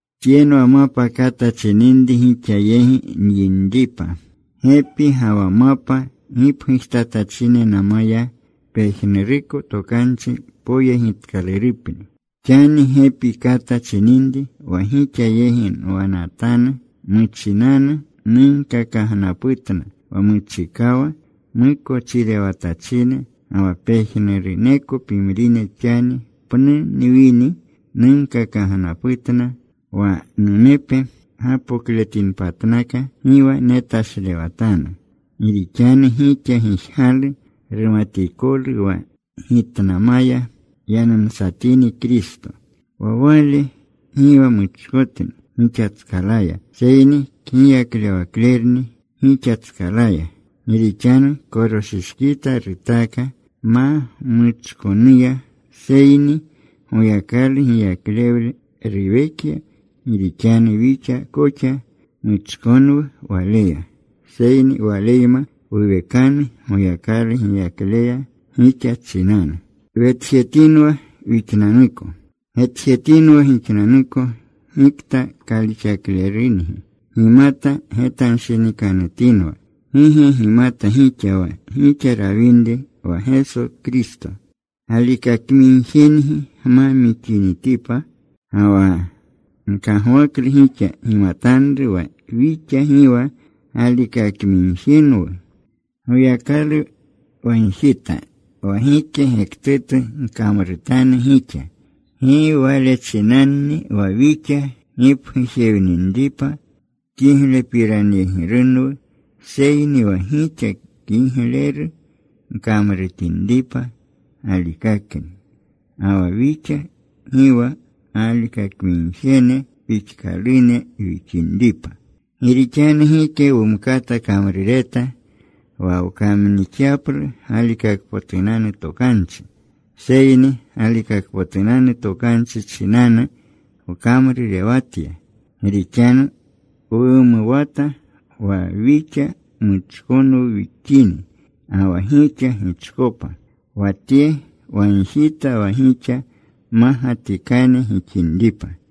Tyenwa mapa kata chininri gixa yegi nyinripa. Gepi ga wa mapa gipgujtatachinenamaya pejnuruko tokanchi poyegitkalurupni. Xani gepi kata chininri wa gixa yegi nwanatanu, muchinanu nunkakagnaputna wa muchikawa mukochirewatachine, ga wa pejnuruneko pimrine xani pnu nwini nunkakagnaputna wa numepe gapokletinpatnaka, gi wa netashlewatanu. Gi rixanu gixa gijgalu rumatikolu wa gitnamaya yanumsatini Kristo. Wa Wale gi wa muchkotni gixatskalaya, seyni kgiyaklewaklerni gixatskalaya. Gi rixanu koroshishkita rutaaka ma muchkonuya, seyni Goyakalu giyaklewle ruwekya. Gi rixanu wixa koxa muchkonwu Waleya, seyni Waleyma wuwekanu Goyakalu giyakleya gixa chinanu. Getjetinwa gixnanuko gikta kalixaklerungi. Gimata getanshinikanutinwa. ¿Gi ge gimata gixa wa gixa rawinri wa Geso Kristo, galikakmigjengi gma mixinitipa? Ga wa nkagwaklu gixa gimatanru wa wixa gi wa galikakamigjenwu. Goyakalu wagjita wa gike gektutu gkamrutanu gixa, gi wale chinanni wa wixa gipgujewinripa kiglepiranyegirunwu, seyni wa gixa kigleru gkamrutinripa galikakni, ga wa wixa gi wa galikakmigjene pixkalune wixinripa. Gi rixanu gike wumkata kamrureta wa wkamnixyaplu galikakpotunanu tokanchi, seyni galikakpotunanu tokanchi chinanu wkamrurewatya. Gi rixanu wumuwata wa wixa muchkonwu wixini ga wa gixa gichkopa. Wa tye wagjita wa gixa mmagatikane gixinripa.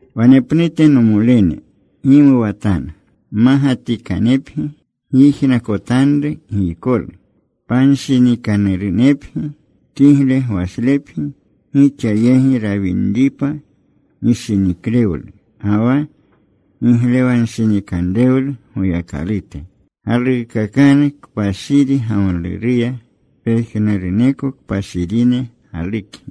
Wanepnute, nomolene, gimuwatanu. Mmagatikanepgi. Gyijnakotanru giykolu. Panshinikanurunepgi. Kigle gwashlepgi. Gixa yegi rawinripa gishiniklewlu ga wa giglewanshinikanrewlu Goyakalute. Galuukakanu kpashiri gamluruya. Pejnuruneko kpashirine galukgi.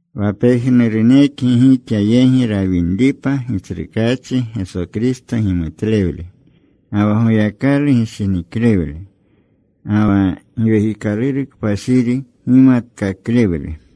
Wa pejnurunekgi gixa yegi rawinripa Gitsrukaachi Geso Kristo gimutlewle, ga wa Goyakalu gishiniklewle, ga wa Giwekikaluru Kpashiri gimatkaklewle.